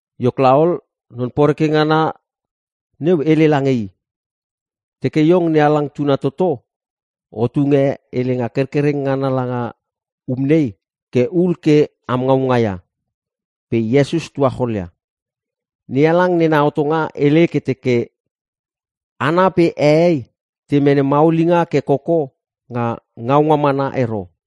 Iok laol, Non Poreke ngana neu hele lange i, “Teke iong NeHalang tuna toto o tunge helenga kerkereng ngana langa um nei ke hul ke am ngaunga ia.” Pe Iesus tuacholia, “NeHalang nena hotonga hele ke teke, ‘Hana pe hehei te mene maulinga ke koko nga ngaunga mana ero.’”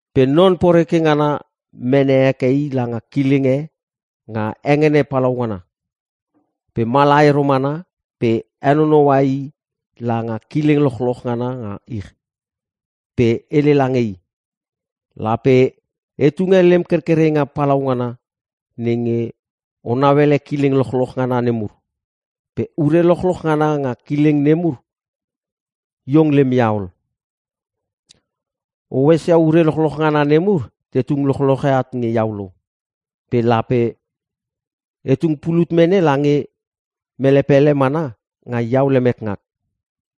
Pe Non Poreke ngana mene heke i langa kileng e nga hengene palaungana. Pe mala ero mana pe henonoua i langa kileng lochloch ngana nga ich. Pe hele lange i, “Lape e tunge lem kerkerenga palaungana nenge o nauele kileng lochloch ngana nemur. Pe ure lochloch ngana nga kileng nemur iong lem ia ol. O esia ure lochloch ngana nemur te tung lochloche at nge iau lo. Pe lape e tung pulut mene lange mele pele mana nga iau lemek ngak.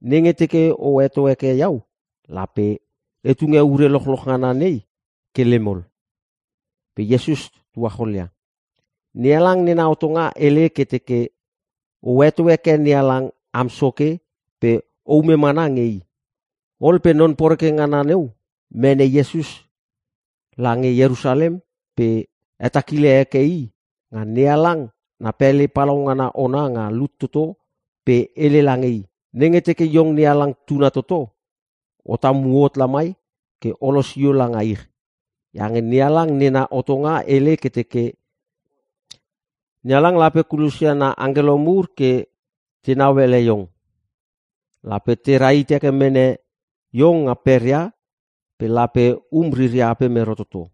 Nenge teke o heto heke iau lape e tunge ure lochloch ngana nei ke lem ol.” Pe Iesus tuacholia, “NeHalang nena hotonga hele ke teke, ‘O heto heke NeHalang am Soke pe oume mana nge i!’” Ol pe non poreke ngana neu mene Iesus lange Ierusalem pe hetakila heke i nga NeHalang na pele palaungana ona nga lut toto pe hele lange i, “Nenge teke iong NeHalang tuna toto, o tamu hot lamai ke o losio langa ich. Iange NeHalang nena hotonga hele ke teke, “‘NeHalang lape kulosia na angkelo mur ke tenau ele iong. Lape tera hit heke mene iong nga peria pe lape um riria apem ero toto.’”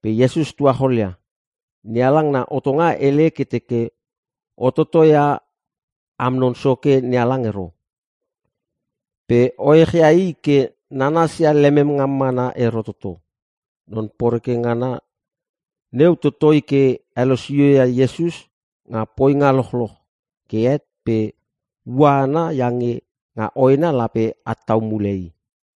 Pe Iesus tuacholia, “NeHalang na hotonga hele ke teke, ‘O totoi ia am Non Soke NeHalang ero. Pe oech ia i ke nanasia lemem ngam mana ero toto.’” Non Poreke ngana neu totoi ke helosio ia Iesus nga poinga lochloch. Ke het pe ua ana iange nga hoena lape at tau mule i.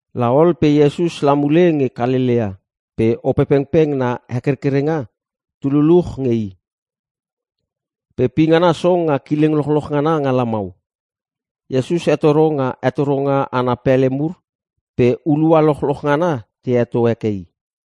La ol pe Iesus la mule nge Kalelea pe Opepengpeng na hekerkerenga tu luchluch nge i. Pe pingana song nga kileng lochloch ngana nga lamau. Iesus hetoro nga hetoronga ana pele mur pe hulua lochloch ngana te heto heke i.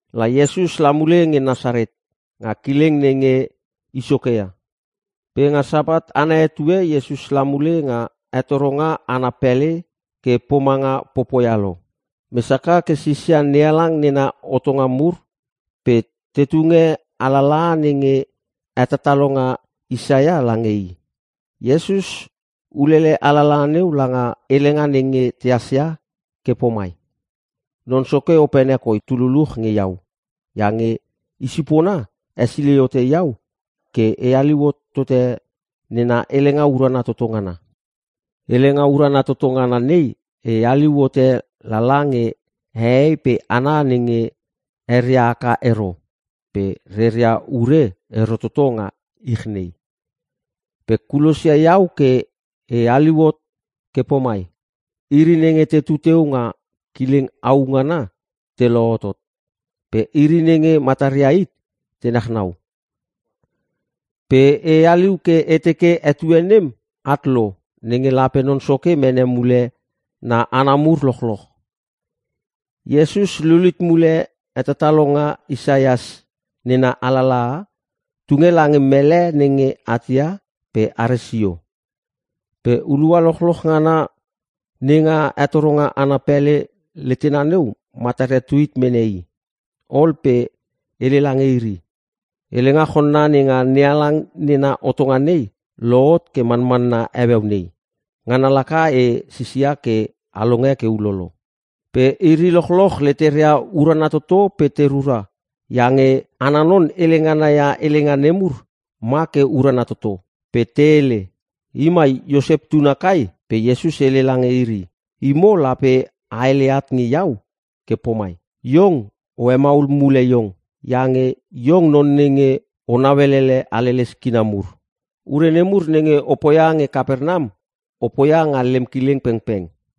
La Iesus la mule nge Nasaret nga kileng nenge i soke ia. Pe nga Sapat ana etue Iesus la mule nga hetoronga ana pele ke pomanga popoia lo. Mes haka ke sisia NeHalang nena hotonga mur pe te tunge alalaha nenge hetatalonga Isaias lange i. Iesus ulele alalaha neu langa helenga nenge tehas ia ke pomai, “Non Soke opene koi tu luluch nge iau iange i sipona hesilei hote iau ke e haliu hotote nena helenga urana toto ngana. Helenga urana toto ngana nei e haliu hote lala nge hehei pe hana nenge eria haka ero pe reria ure ero toto nga ich nei. Pe kulosia iau ke e haliu hot ke pomai: Iri nenge tetu teu nga kileng au ngana te lohotot. Pe iri nenge mataria hit te nachnau. Pe e haliu ke e teke, etue nem at lo nenge lape Non Soke mene mule na hana mur lochloch.” Iesus lulit mule hetatalonga Isaias nena alalaha tunge lange mele nenge atia pe are sio. Pe hulua lochloch ngana nenga hetoronga ana pele letena neu mataria tuit mene i. Ol pe hele lange iri, “Helenga chonna nenga NeHalang nena hotonga nei lohot ke manmanna heueu nei, ngana laka e sisia ke a longe ke ulolo.” Pe iri lochloch leteria urana toto pe te rura iange ana non hele ngana ia helenga nemur ma ke urana toto. Pe te hele, “I mai Iosep tuna kai!?” Pe Iesus hele lange iri, “Imo lape a hele at nge iau ke pomai, ‘Iong o hemaul mule iong. Iange iong non nenge o nauelele haleles kina mur. Ure nemur nenge o poia nge Kapernam o poia nga lem kileng pengpeng.’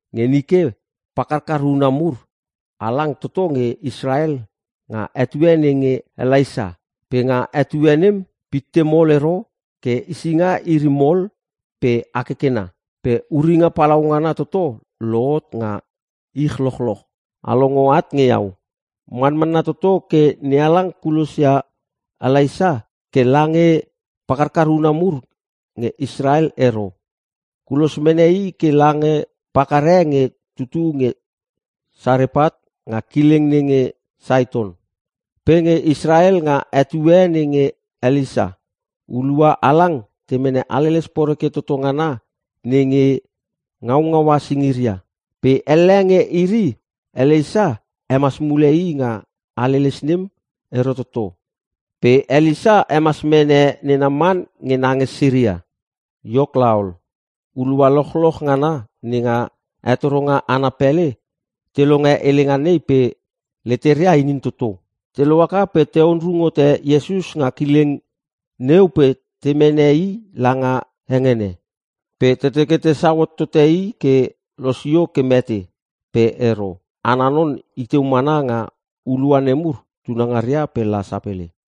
Nge nike pakarkar una mur halang toto nge Israel nga etue nenge Elaisa. Pe nga etue nem pitte mol ero ke hesinga iri mol pe hakekena. Pe uringa palaungana toto lohot nga ich lochloch. A longo at nge iau. Manmanna toto ke NeHalang kulosia Elaisa ke lange pakarkar una mur nge Israel ero. Kulos mene i ke lange pakar e nge tutu nge Sarepat nga kileng nenge Saiton. “Pe nge Israel nga etue nenge Elisa, hulua halang temene haleles poreke toto ngana nenge ngaungaua singiria. Pe elle nge iri Elisa hemas mule i nga haleles nem ero toto. Pe Elisa hemas mene ne Naman nge na nge Siria.” Iok laol, hulua lochloch ngana nenga hetoronga ana pele te longe helenga nei pe leteria inin toto. Te lohaka pe te onrung hote Iesus nga kileng neu pe temene i langa hengene. Pe te teke tesau hot tote i ke losio ke mete. Pe ero, ana non iteu mana nga hulua nemur tunangaria pe la sapele.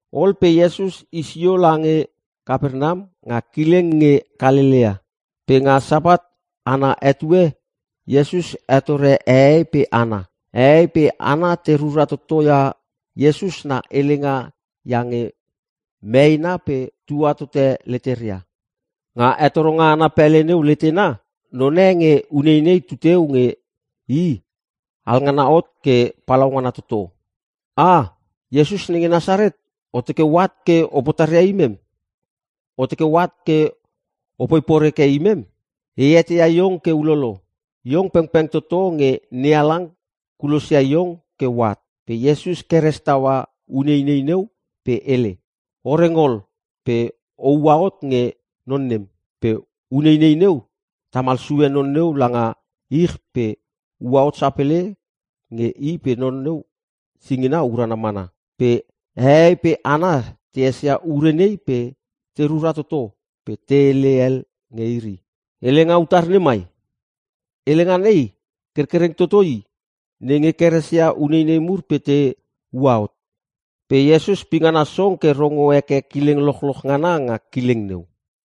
Ol pe Iesus i sio lange Kapernam nga kileng nge Kalelea. Pe nga Sapat ana etue Iesus hetore hehei pe hana. Hehei pe hana te rura totoia Iesus na helenga iange meena pe tua tote leteria. Nga hetoronga ana pele neu letena none nge uneinei tuteu nge i alngana hot ke palaungana toto. “Ah! Iesus nenge Nasaret o teke oat ke o potaria imem? O teke oat ke opoi poreke imem? E eteia iong ke ulolo. Iong pengpeng toto nge NeHalang kulosia iong ke oat.” Pe Iesus keres taua uneinei neu pe hele, “O reng ol pe oua hot nge non nem!” Pe uneinei neu tamal sue non neu langa ich pe ua hot sapele nge i pe non neu singina urana mana. Pe hehei pe hana te esia ure nei pe te rura toto pe te hele el nge iri, “Helenga utar nemai? Helenga nei kerkereng toto i nenge keresia uneinei mur pe te ua hot.” Pe Iesus pingana song ke rongo heke kileng lochloch ngana nga kileng neu.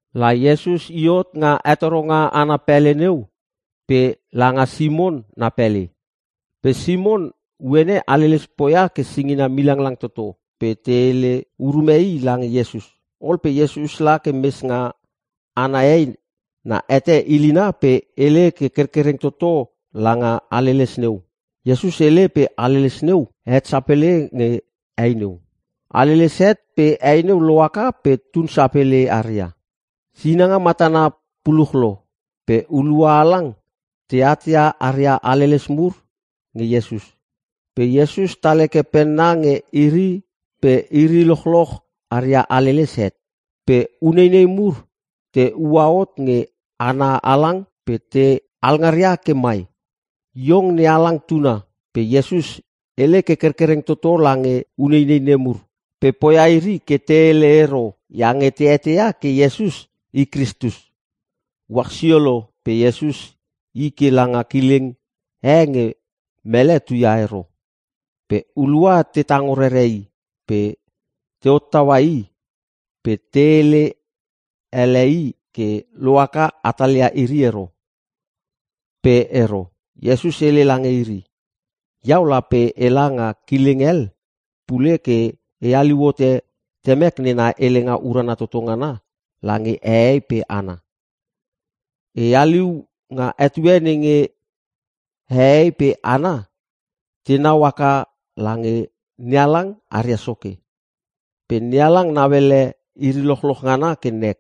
La Iesus i hot nga hetoronga ana pele neu pe langa Simon na pele. Pe Simon uene, haleles poia ke singina milanglang toto pe te hele urume i lange Iesus. Ol pe Iesus la ke mes nga ana hei na hete ilina pe hele ke kerkereng toto langa haleles neu. Iesus hele pe haleles neu het sapele nge hei neu. Haleles het pe hei neu loaka pe tun sapele aria. Sinanga matana puluch lo pe hulua halang te atia aria haleles mur nge Iesus. Pe Iesus tal heke penna nge iri pe iri lochloch aria haleles het. Pe uneinei mur te ua hot nge hana halang pe te alngaria ke mai, “Iong NeHalang tuna!” Pe Iesus hele ke kerkereng toto lange uneinei nemur, pe poia iri ke te hele ero iange te eteia ke Iesus i Kristus nem. Uach sio lo pe Iesus i ke langa kileng e nge mele tuaia ero. Pe hulua te tango rere i pe te hottaua i pe te hele ele i ke lohaka hatalia iri ero. Pe ero. Iesus hele lange iri, “Iau lape ela nga kileng hel pule ke e haliu hote Temek nena helenga urana toto ngana lange hehei pe hana. E haliu nga etue nenge hehei pe hana tenau haka lange NeHalang aria Soke. Pe NeHalang nauele iri lochloch ngana ke nek.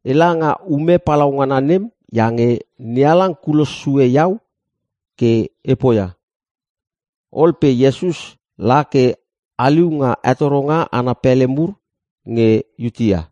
Ela nga ume palaungana nem iange NeHalang kulos sue iau ke e poia.” Ol pe Iesus la ke haliu nga hetoronga ana pele mur nge Iutea.